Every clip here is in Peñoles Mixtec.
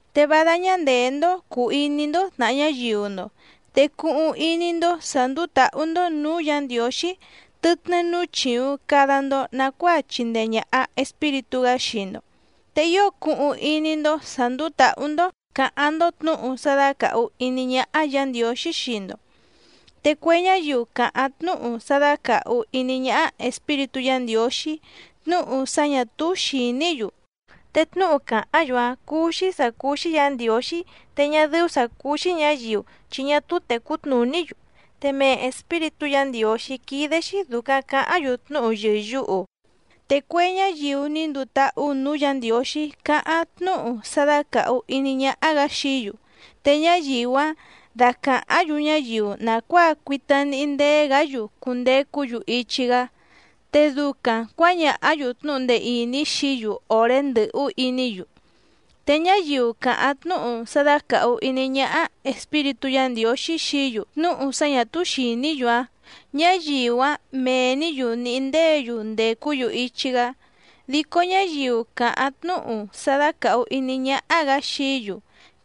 Te vá dáñá ndèé‑ndó cùu iní‑ndó tnàha ñáyiu‑ndo, te cuhuⁿ iní‑ndó sǎ ndùu táhú‑ndó nǔú Yǎ Ndiǒxí tɨtnɨ́ núú chìuⁿ cada‑ndo nacuáa chindee ñàha Espíritú‑gá xii‑ndo, te ío cuhuⁿ iní‑ndó sǎ ndúú tǎhú‑ndó cǎháⁿ‑ndó tnǔhu sá dácàhu iní ñáhá Yǎ Ndiǒxí xii‑ndo. Te cue ñáyiu càháⁿ tnúhu sá dácàhu iní ñáhá Espíritú Yǎ Ndiǒxí tnúhu sá ñà túú xìní‑yu, te tnúhu càháⁿ‑yu‑áⁿ cúú‑xí sǎ cúú‑xí Yǎ Ndiǒxí te ñá dɨ́ú sǎ cúú‑xí ñǎyiu chi ñá túú tècú tnùní‑yu, te mee Espíritú Yǎ Ndiǒxí quídé‑xí dùcaⁿ caháⁿ‑yu tnúhu yɨ̀yuhu. Te cue ñáyiu ní nduu táhú nǔú Yǎ Ndiǒxí cáháⁿ tnúhu sá dácàhu iní ñáhá‑gǎ xií‑yu, te ñáyiu‑áⁿ dácàháⁿ‑yu ñáyiu nàcuáa cuita níhí ndéé‑gǎ‑yu cundecú‑yu ichi‑gá, te ducaⁿ cuǎñàhá‑yu tnúhu ndee ìní xií‑yu òré ndɨ̀hú iní‑yu. Te ñáyiu càháⁿ tnúhu sá dácàhu iní ñáhá Espíritú Yǎ Ndiǒxí xií‑yu tnúhu sá ñà túú xìní‑yu‑áⁿ, ñáyiu‑áⁿ mee‑nǐ‑yu nìhí ndéě‑yu ndècú‑yu ichi‑gá. Dico ñáyiu càháⁿ tnúhu sá dácàhu iní ñáhá‑gǎ xií‑yu,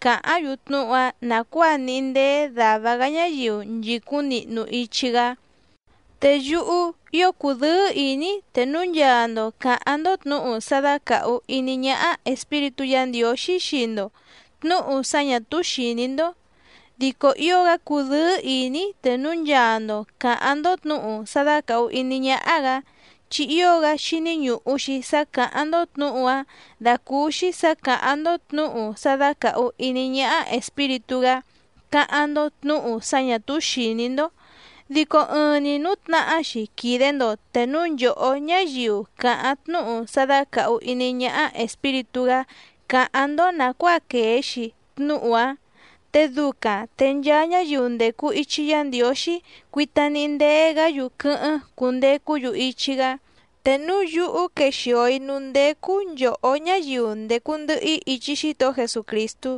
càháⁿ‑yu tnúhu‑áⁿ nàcuáa níhí ndéé dàva‑gá ñáyiu nchìcúⁿ nihnu ichi‑gá. Te yúhú ío cudɨ́ɨ́ ìní‑í te núu nchaa‑ndo cǎháⁿ‑ndó tnǔhu sá dácàhu iní ñáhá Espíritú Yǎ Ndiǒxí xii‑ndo tnǔhu sá ñà túú xìní‑ndó. Dico ío‑gá cúdɨ̌ɨ́ ìní‑í te núu nchaa‑ndo cǎháⁿ‑ndó tnǔhu sá dácàhu iní ñáhá‑gǎ, chi ío‑gá xíní ñùhu‑xi sá càháⁿ‑ndó tnǔhu‑áⁿ dàcúúxí sǎ càháⁿ‑ndó tnǔhu sá dácàhu iní ñáhá Espíritú‑gá cáháⁿ‑ndó tnǔhu sá ñà túú xìní‑ndó. Dico ɨɨⁿ‑ni nǔtnahá‑xi quìde‑ndo te núu nchòhó ñáyiu càháⁿ tnúhu sá dácàhu iní ñáhá Espíritú‑gá cáháⁿ‑ndó nàcuáa quèe‑xi tnúhu‑áⁿ. Te ducaⁿ te nchaa ñáyiu ndècu ichi Yá Ndiǒxí cuita níhí ndéé‑gǎ‑yu quɨ́hɨ́ⁿ cundecú‑yu ichi‑gá. Te núu yúhú quexìo‑í núú ndécú nchòhó ñáyiu ndècu ndɨhɨ‑í ichi Xítohó Jesucrìstú,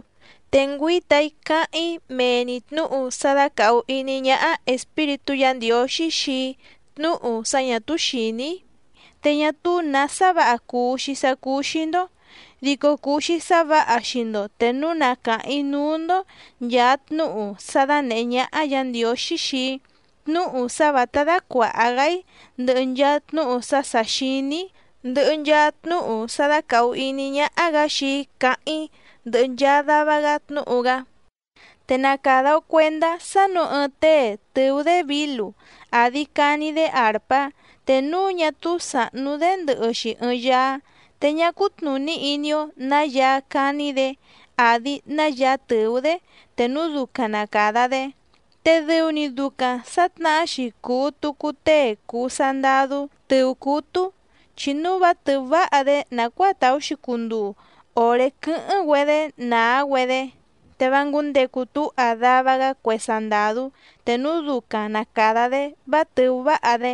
te ngüíta‑í cáháⁿ‑í mee‑ni tnǔhu sá dácàhu iní ñáhá Espíritú Yǎ Ndiǒxí xii‑í tnúhu sá ñà túú xìní‑í, te ñá túú nǎ sá vǎha cuu‑xi sá cúú‑xí‑ndó. Dico cuu‑xi sá vǎha xii‑ndo te núu na càháⁿ‑í núú‑ndó nchàa tnúhu sá dánèhé ñáhá Yǎ Ndiǒxí xii‑í tnúhu sá vǎtá dácuàha‑gá‑í, ndɨhɨ nchaa tnúhu sá sà xiní‑í, ndɨhɨ nchaa tnúhu sá dácàhu iní ñáhá‑gǎ xii‑í cáháⁿ‑í, ndɨhɨ nchaa dava‑gá tnúhu‑gá. Te na càda‑o cuendá sá nǔu ɨɨⁿ tée tɨ̀ú‑dé vǐlu àdi cani‑dé àrpá te núu ñá túú sàhnú‑dé ndɨhɨ‑xi ɨɨⁿ yaá, te ñá cútnùní iní‑ó nǎ yaá cání‑dě àdi ná yaá tɨ̀ú‑dé te núu ducaⁿ na càda‑dé. Te dɨu‑ni ducaⁿ sǎtnahá‑xi cùu tucu tée cùu sandadú tɨ̀ú cútú, chi núu vá tɨ̀ú váha‑dé nàcuáa tàú‑xi cunduu òré quɨ́hɨ́ⁿ‑güedé nàá‑güedé, te vá ngǔndecu túha dava‑gá cue sandàdú te núu ducaⁿ na càda‑dé vá tɨ̀ú váha‑dé.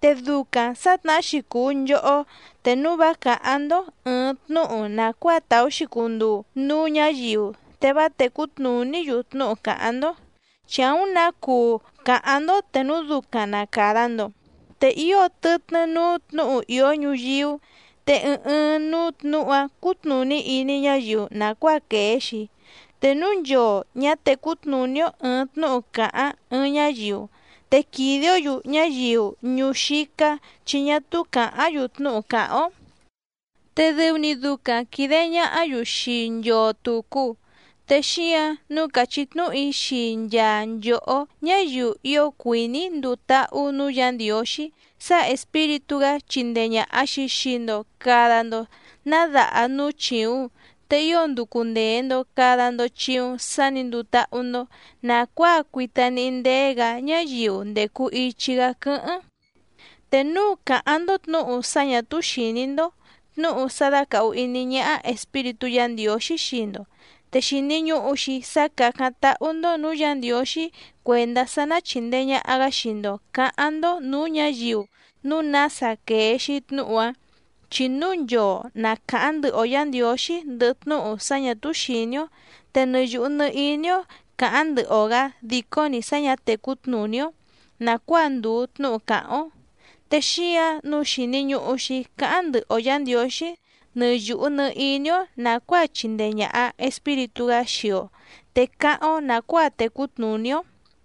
Te ducaⁿ sǎtnahá‑xi cùu nchohó te núu vá càháⁿ‑ndó ɨ̀ɨⁿ tnúhu nàcuáa tàú‑xi cunduu núú ñǎyiu te vá tècú tnùní‑yu tnúhu càháⁿ‑ndó. ¡Chi àúⁿ nǎ cuu càháⁿ‑ndó te núu ducaⁿ na càda‑ndo! Te ío tɨtnɨ́ núú tnǔhu ìó ñuyíú, te ɨɨⁿ ɨɨⁿ núú tnǔhu‑áⁿ cútnùní iní ñáyiu nàcuáa quèe‑xi. Te núu nchoo ñǎ tècú tnùní‑ó ɨ̀ɨⁿ tnúhu càháⁿ ɨɨⁿ ñáyiu, te quìde‑ó‑yu ñáyiu ñuú xícá chi ñá túú càháⁿ‑yu tnúhu càháⁿ‑ó, te dɨu‑ni ducaⁿ quìde ñahá‑yu xii nchoo tùcu. Te xíǎⁿ nǔu càchí tnúhu‑í xii nchaa nchòhó ñáyiu ío cuìní nduu táhú nǔú Yǎ Ndiǒxí sá Espíritú‑gá chindee ñàha‑xi xii‑ndo cada‑ndo ná daha núú chìuⁿ, te ío nducu ndèe‑ndo cada‑ndo chiuⁿ sá nǐ nduu táhú‑ndó nàcuáa cuita níhí ndéé‑gǎ ñáyiu ndècu ichi‑gá quɨ́hɨ́ⁿ. Te núu càháⁿ‑ndó tnǔhu sá ñà túú xìní‑ndó, tnúhu sá dácàhu iní ñáhá Espíritú Yǎ Ndiǒxí xii‑ndo, te xìni ñuhu‑xi sá càcáⁿ táhú‑ndó nǔú Yǎ Ndiǒxí cuèndá sá ná chìndee ñaha‑gá xii‑ndo cǎháⁿ‑ndó nǔú ñǎyiu núu nása quèe‑xi tnúhu‑áⁿ. Chi núu nchoo na càháⁿ ndɨhɨ‑o Yǎ Ndiǒxí ndɨhɨ tnúhu sá ñà túú xìní‑ó, te nɨ yùhu nɨ iní‑ó càháⁿ ndɨhɨ‑o‑gǎ dìcó‑ni sá ñǎ tècú tnùní‑ó nàcuáa ndùu tnúhu càháⁿ‑ó. Te xíǎⁿ nǔu xìni ñuhu‑xi cáháⁿ ndɨhɨ‑o Yǎ Ndiǒxí nɨ yùhu nɨ iní‑ó nàcuáa chìndee ñaha Espíritú‑gá xii‑o te cáháⁿ‑ó nàcuáa tecú tnùní‑ó,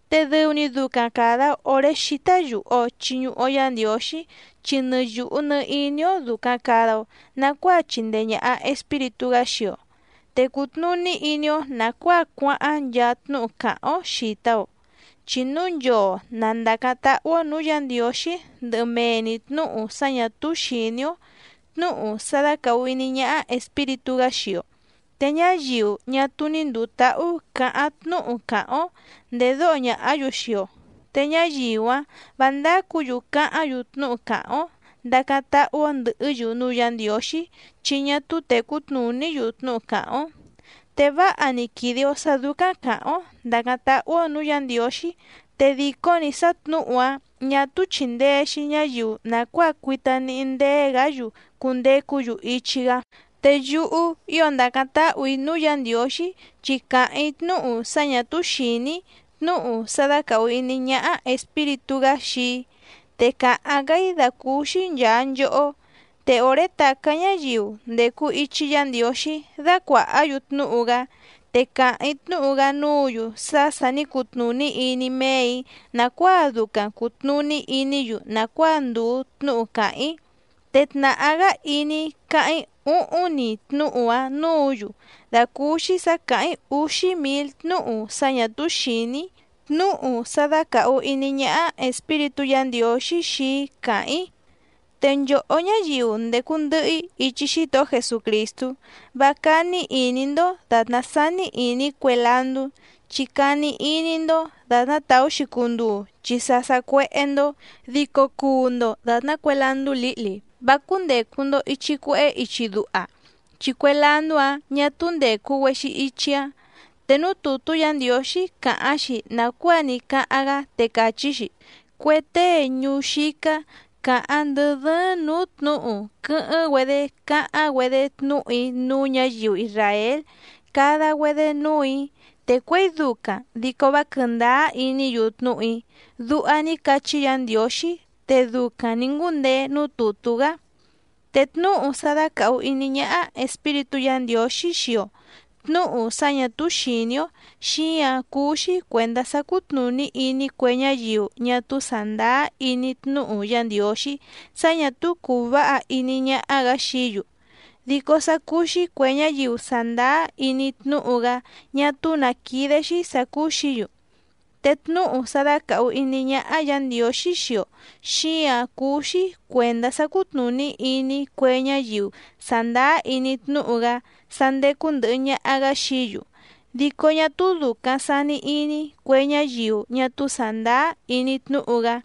te dɨu‑ni ducaⁿ càda‑o oré xítá yùhu‑o chiñuhu‑o Yá Ndiǒxí, chi nɨ yùhu nɨ iní‑ó dùcaⁿ cada‑o nacuáa chìndee ñaha Espíritú‑gá xii‑o, te cùtnuní iní‑ó nàcuáa cuáháⁿ nchaa tnúhu càháⁿ‑ó xìta‑o. Chi núu nchoo na ndàcáⁿ táhú‑ó nǔú Yǎ Ndiǒxí ndɨhɨ mee‑ni tnǔhu sá ñà túú xìní‑ó tnǔhu sá dácàhu iní ñáhá Espíritú‑gá xii‑o, te ñáyiu ñá túú ní ndùu táhú cǎháⁿ tnúhu càháⁿ‑ó ndèdóho ñàhá‑yu xii‑o, te ñáyiu‑áⁿ vǎ ndácǔ‑yu cáháⁿ‑yu tnúhu càháⁿ‑ó ndàcáⁿ táhú‑ó ndɨ̀hɨ́‑yu núú Yǎ Ndiǒxí chi ñá túú tècú tnùní‑yu tnúhu càháⁿ‑ó. Te váha‑ni quìde‑o sá dúcáⁿ càháⁿ‑ó ndàcáⁿ táhú‑ó nǔú Yǎ Ndiǒxí, te dìcó‑ni sá tnǔhu‑áⁿ ñà túú chìndee‑xi ñáyiu nàcuáa cuita níhí ndéé‑gǎ‑yu cundecú‑yu ichi‑gá. Te yúhú ío ndàcáⁿ táhù‑í núú Yǎ Ndiǒxí chi càháⁿ‑í tnúhu sá ñà túú xìní‑í tnúhu sá dácàhu iní ñáhá Espíritú‑gá xii‑í, te càháⁿ‑gá‑í dàcúúxí nchàa nchohó. Te òré tàcá ñáyiu ndècu ichi Yá Ndiǒxí dácuàhá‑yu tnúhu‑gá, te càháⁿ‑í tnúhu‑gá núǔ‑yu sá sà ní cutnùní iní méè‑í nàcuáa ducaⁿ cùtnuní iní‑yu nàcuáa ndùu tnúhu càháⁿ‑í. Te tnàhá‑gá iní‑í cáháⁿ‑í úhúⁿ‑ni tnúhu‑áⁿ nǔǔ‑yu dàcúúxí sǎ càháⁿ‑í úxí mǐl tnúhu sá ñà túú xìní‑í, tnúhu sá dácàhu iní ñáhá Espíritú Yǎ Ndiǒxí xii‑í càháⁿ‑í. Te nchòhó ñáyiu ndècu ndɨhɨ‑í ichi Xítohó Jesucrìstú, vá cání ìní‑ndó dàtná sání ìní cue landú, chi cani iní‑ndó dàtná tàú‑xi cunduu chi sa sacuéhé‑ndó. Dico cuu‑ndo dàtná cue landú lǐhli vá cúndècu‑ndo ichi cuehé ichi duha, chi cue landú‑áⁿ ñà túú ndècu‑güexi ichi‑áⁿ. Te núú tùtú Yǎ Ndiǒxí càháⁿ‑xi nàcuáa ní cáháⁿ‑gá, te càchí‑xi: “Cue tée ñuú xícá càháⁿ ndɨ dɨ́ɨ́ⁿ nǔú tnǔhu quɨ́hɨ́ⁿ‑güedé cáháⁿ‑güedé tnúhu‑í núú ñǎyiu isràél cada‑güedé núù‑í, te cuěi ducaⁿ dico vá quɨ̀ndáá iní‑yu tnúhu‑í”, duha ní cachí Yǎ Ndiǒxí te ducaⁿ nǐ ngúndeé núú tùtú‑gá. Te tnúhu sá dácàhu iní ñáhá Espíritú Yǎ Ndiǒxí xii‑o tnǔhu sá ñà túú xìní‑ó, xíǎⁿ cúú‑xí cuèndá sá cútnùní iní cue ñáyiu ñá túú sàndáá iní tnúhu Yá Ndiǒxí sá ñà túú cùu váha iní ñáhá‑gǎ xií‑yu. Dico sá cúú‑xí cuè ñáyiu sàndáá iní tnúhu‑gá ñá túú nǎ quídé‑xí sǎ cúú‑xǐ‑yu. Te tnúhu sá dácàhu iní ñáhá Yǎ Ndiǒxí xii‑o, xíǎⁿ cúú‑xí cuèndá sá cútnùní iní cue ñáyiu sàndáá iní tnúhu‑gá sá ndécú ndɨ̀hɨ ñaha‑gá xií‑yu, dico ñá túú dùcaⁿ sani iní cue ñáyiu ñá túú sàndáá iní tnúhu‑gá.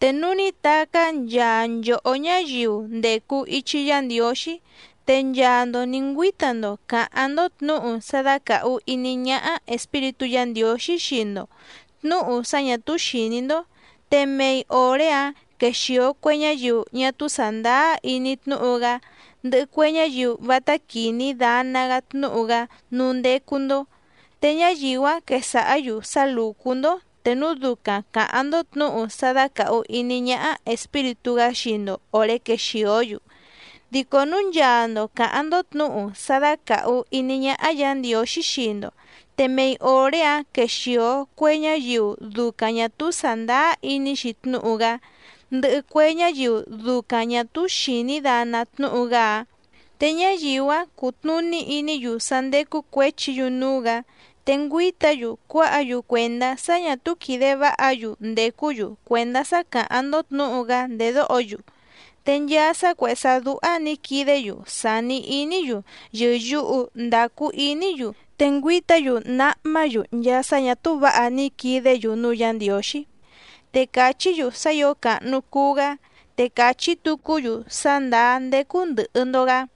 Te núu ní tacá nchaa nchòhó ñáyiu ndècu ichi Yá Ndiǒxí, te nchaa‑ndo nǐ ngüíta‑ndo càháⁿ‑ndó tnǔhu sá dácàhu iní ñáhá Espíritú Yǎ Ndiǒxí xii‑ndo tnǔhu sá ñà túú xìní‑ndó, te mei òré‑áⁿ quexìo cue ñáyiu ñá túú sàndáá iní tnúhu‑gá, ndɨhɨ cue ñáyiu vátá quìní dana‑gá tnúhu‑gá núú ndécú‑ndó, te ñáyiu‑áⁿ quesàhá‑yu sá lùcú‑ndó te núu ducaⁿ càháⁿ‑ndó tnǔhu sá dácàhu iní ñáhá Espíritú‑gá xii‑ndo òré quexìó‑yu. Dico núu nchaa‑ndo càháⁿ‑ndó tnǔhu sá dácàhu iní ñáhá Yǎ Ndiǒxí xii‑ndo, te mei òré‑áⁿ quexìo cue ñáyiu ducaⁿ ñà túú sàndáá iní‑xi tnúhu‑gá, ndɨhɨ cue ñáyiu ducaⁿ ñà túú xìní dana tnúhu‑gá‑áⁿ, te ñáyiu‑áⁿ cutnùní iní‑yu sá ndécú cuěchi‑yu núú‑gǎ, te ngüíta‑yu cuáha‑yu cuèndá sá ñà túú quìde váha‑yu ndècú‑yu cuèndá sá càháⁿ‑ndó tnǔhu‑gá ndèdóho‑yu. Te nchaa sá cuèhé sá dúhá nǐ quidé‑yu sàni iní‑yu yɨ̀yuhu ndacu iní‑yu, te ngüíta‑yu náhmá‑yu nchaa sá ñà túú vǎha ní quidé‑yu núú Yǎ Ndiǒxí, te cachí‑yu sá ǐo càhnu cuu‑gá, te cachí tucú‑yu sá ndàá ndécú ndɨ̀hɨ‑ndo‑gá.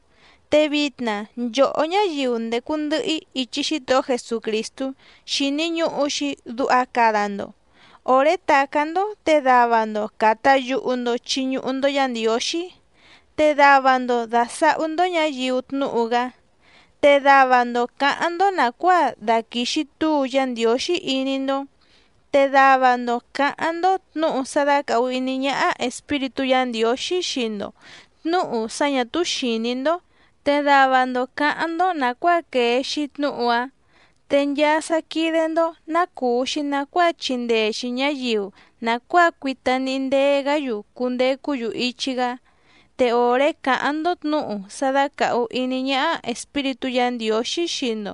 Te vitna nchòhó ñáyiu ndècu ndɨhɨ‑í ichi Xítohó Jesucrìstú xìni ñuhu‑xi duha cada‑ndo. Òré tàcá‑ndó te dava‑ndo càta yuhu‑ndo chiñuhu‑ndo Yá Ndiǒxí, te dava‑ndo dàsahú‑ndó ñǎyiu tnúhu‑gá, te dava‑ndo cǎháⁿ‑ndó nàcuáa dàquixi túu Yá Ndiǒxí iní‑ndó, te dava‑ndo cǎháⁿ‑ndó tnǔhu sá dácàhu iní ñáhá Espíritú Yǎ Ndiǒxí xii‑ndo tnǔhu sá ñà túú xìní‑ndó, te dava‑ndo cǎháⁿ‑ndó nàcuáa quèe‑xi tnúhu‑áⁿ. Te nchaa sá quídé‑ndó ná cùu‑xi nacuáa chindee‑xi ñǎyiu nàcuáa cuita níhí ndéé‑gǎ‑yu cundecú‑yu ichi‑gá. Te òré càháⁿ‑ndó tnǔhu sá dácàhu iní ñáhá Espíritú Yǎ Ndiǒxí xii‑ndo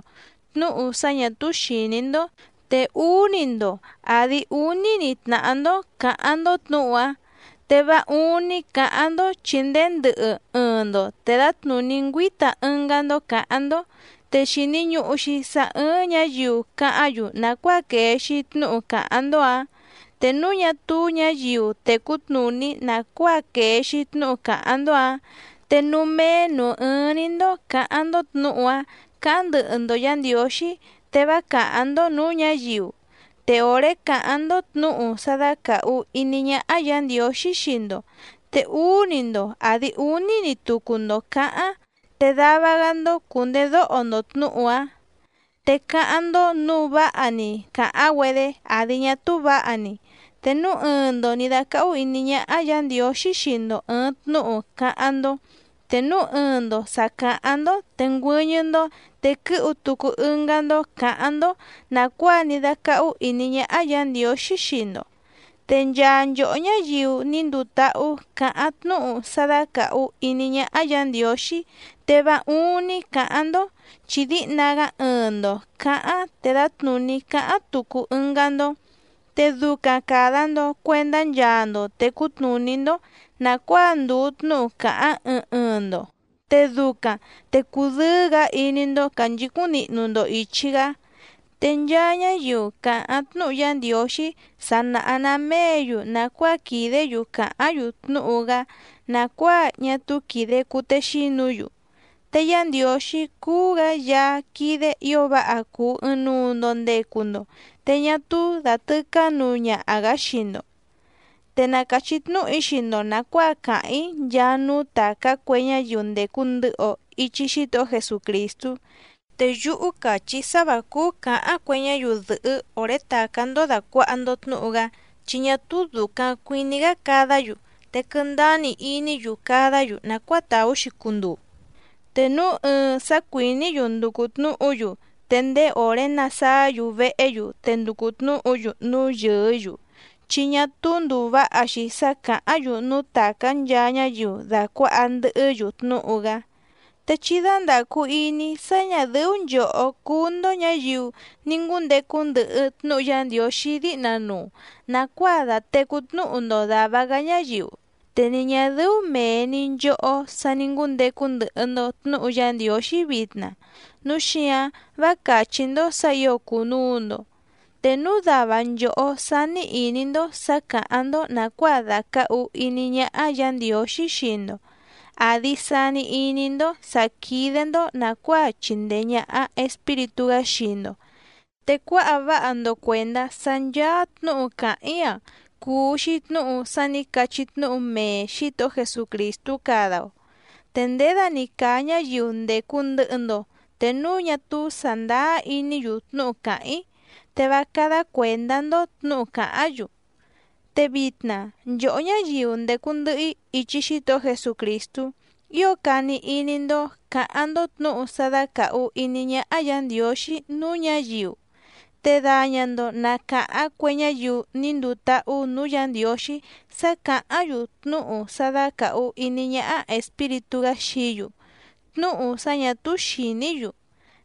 tnǔhu sá ñà túú xìní‑ndó, te úú‑ni‑ndo àdi úní‑ni tnàhá‑ndó cǎháⁿ‑ndó tnǔhu‑áⁿ te vá úúⁿní cǎháⁿ‑ndó chi ndéé ndɨhɨ ɨɨⁿ‑ndo te dǎtnùní ngüíta ɨngá‑ndó cǎháⁿ‑ndó. Te xìni ñuhu‑xi sá ɨ́ɨ́ⁿ ñǎyiu cáháⁿ‑yu nàcuáa quèe‑xi tnúhu càháⁿ‑ndó‑ǎⁿ. Te núu ñá túú ñǎyiu tècú tnùní nàcuáa quèe‑xi tnúhu càháⁿ‑ndó‑ǎⁿ, te núú méé nǔú ɨ́ɨ́ⁿ‑ní‑ndó cǎháⁿ‑ndó tnǔhu‑áⁿ cǎháⁿ ndɨhɨ‑ndo Yǎ Ndiǒxí te vá càháⁿ‑ndó nǔú ñǎyiu. Te òré càháⁿ‑ndó tnǔhu sá dácàhu iní ñáhá Yǎ Ndiǒxí xii‑ndo te úú‑ni‑ndo àdi úní‑ni tucu‑ndo cǎháⁿ, te dava‑gá‑ndó cùndedóho‑ndo tnǔhu‑áⁿ te cáháⁿ‑ndó nǔu váha‑ni càháⁿ‑güedé àdi ñá túú vǎha‑ni. Te núu ɨɨⁿ‑ndo nǐ dácáhú ìní ñáhá Yǎ Ndiǒxí xii‑ndo ɨ̀ɨⁿ tnúhu cáháⁿ‑ndó, te núu ɨɨⁿ‑ndo sà caháⁿ‑ndó te ngüɨ́ñɨ́‑ndó te quɨ́hu tucu ɨngá‑ndó cǎháⁿ‑ndó nàcuáa ní dácáhú ìní ñáhá Yǎ Ndiǒxí xii‑ndo. Te nchaa nchòhó ñáyiu ní nduu táhú cǎháⁿ tnúhu sá dácàhu iní ñáhá Yǎ Ndiǒxí, te vá úúⁿ‑ní cǎháⁿ‑ndó chi díhna‑gá ɨɨⁿ‑ndo cǎháⁿ te dǎtnùní cáháⁿ tucu ɨngá‑ndó. Te ducaⁿ càda‑ndo cuendá nchaa‑ndo tècú tnùní‑ndó nàcuáa ndùu tnúhu càháⁿ ɨɨⁿ ɨɨⁿ‑ndo, te ducaⁿ te cudɨ́ɨ́‑gǎ iní‑ndó cànchicúⁿ nihnu‑ndo ìchi‑gá. Te nchaa ñáyiu càháⁿ tnúhu Yá Ndiǒxí sa nàha‑ná méě‑yu nàcuáa quìdé‑yu càháⁿ‑yu tnúhu‑gá nàcuáa ñá túú quìde cutexínu‑yu. Te Yá Ndiǒxí cúú‑gǎ Yaá quídé ǐo váha cùu ɨɨⁿnuu‑ndo ndecu‑ndo, te ñá túú dàtɨcá nuu ñaha‑gǎ xii‑ndo. Te na càchí tnúhu‑í xii‑ndo nàcuáa càháⁿ‑í nchaa núú tàcá cue ñáyiu ndècu ndɨhɨ‑o ichi Xítohó Jesucrìstú. Te yúhú càchí‑í sá vǎ cúú cǎháⁿ cue ñáyiu dɨ̀hɨ́ òré tàcá‑ndó dàcuaha‑ndo tnúhu‑gá, chi ñá túú dùcaⁿ cuiní‑gá cadá‑yu, te quɨ́ndáá‑ni iní‑yu cadá‑yu nàcuáa tàú‑xi cunduu. Te núu ɨɨⁿ sá cuìní‑yu nducu tnǔhu‑yu te ndéé òré nasáá‑yu vehé‑yu te nducu tnǔhu‑yu núú yɨɨ́‑yu, chi ñá túú ndùu váha‑xi sá càháⁿ‑yu núú tàcá nchaa ñáyiu dàcuáha ndɨhɨ́‑yu tnúhu‑gá. Te chí dándàcu iní sá ñà dɨ́ú nchòhó cúú‑ndó ñǎyiu ní ngúndecu ndɨhɨ tnúhu Yá Ndiǒxí díhna nuu nàcuáa datècú tnúhu‑ndo dàva‑gá ñáyiu, te ni ñà dɨ́ú mèe‑ni nchohó sa ní ngúndecu ndɨhɨ‑ndo tnǔhu Yá Ndiǒxí vitna, núu xíǎⁿ vá càchí‑ndó sǎ ǐo cùnuu‑ndo. Te núu dava nchòhó sání ìní‑ndó sǎ càháⁿ‑ndó nàcuáa dàcahu iní ñáhá Yǎ Ndiǒxí xii‑ndo àdi sani iní‑ndó sǎ quídé‑ndó nàcuáa chìndee ñaha Espíritú‑gá xii‑ndo, te cuáha váha‑ndo cuèndá sá ncháá tnǔhu càháⁿ‑í‑a cùu‑xi tnúhu sá nǐ cachí tnúhu mee Xǐtohó Jesucrìstú cada‑o. Te nděda‑ni càa ñáyiu ndècu ndɨhɨ‑ndo te núu ñá túú sàndáá iní‑yu tnúhu càháⁿ‑í, te vá cádá cuèndá‑ndó tnǔhu càháⁿ‑yu. Te vitna nchòhó ñáyiu ndècu ndɨhɨ‑í ichi Xítohó Jesucrìstú, ío cani iní‑ndó cǎháⁿ‑ndó tnǔhu sá dácàhu iní ñáhá Yǎ Ndiǒxí núú ñǎyiu, te daña‑ndo na càháⁿ cue ñáyiu ní nduu táhú nǔú Yǎ Ndiǒxí sá càháⁿ‑yu tnúhu sá dácàhu iní ñáhá Espíritú‑gá xií‑yu tnúhu sá ñà túú xìní‑yu.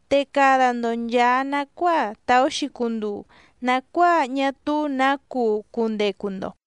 Te cada‑ndo nchàa nacuáa tàú‑xi cunduu nàcuáa ñá túú nǎ cuu cundecu‑ndo.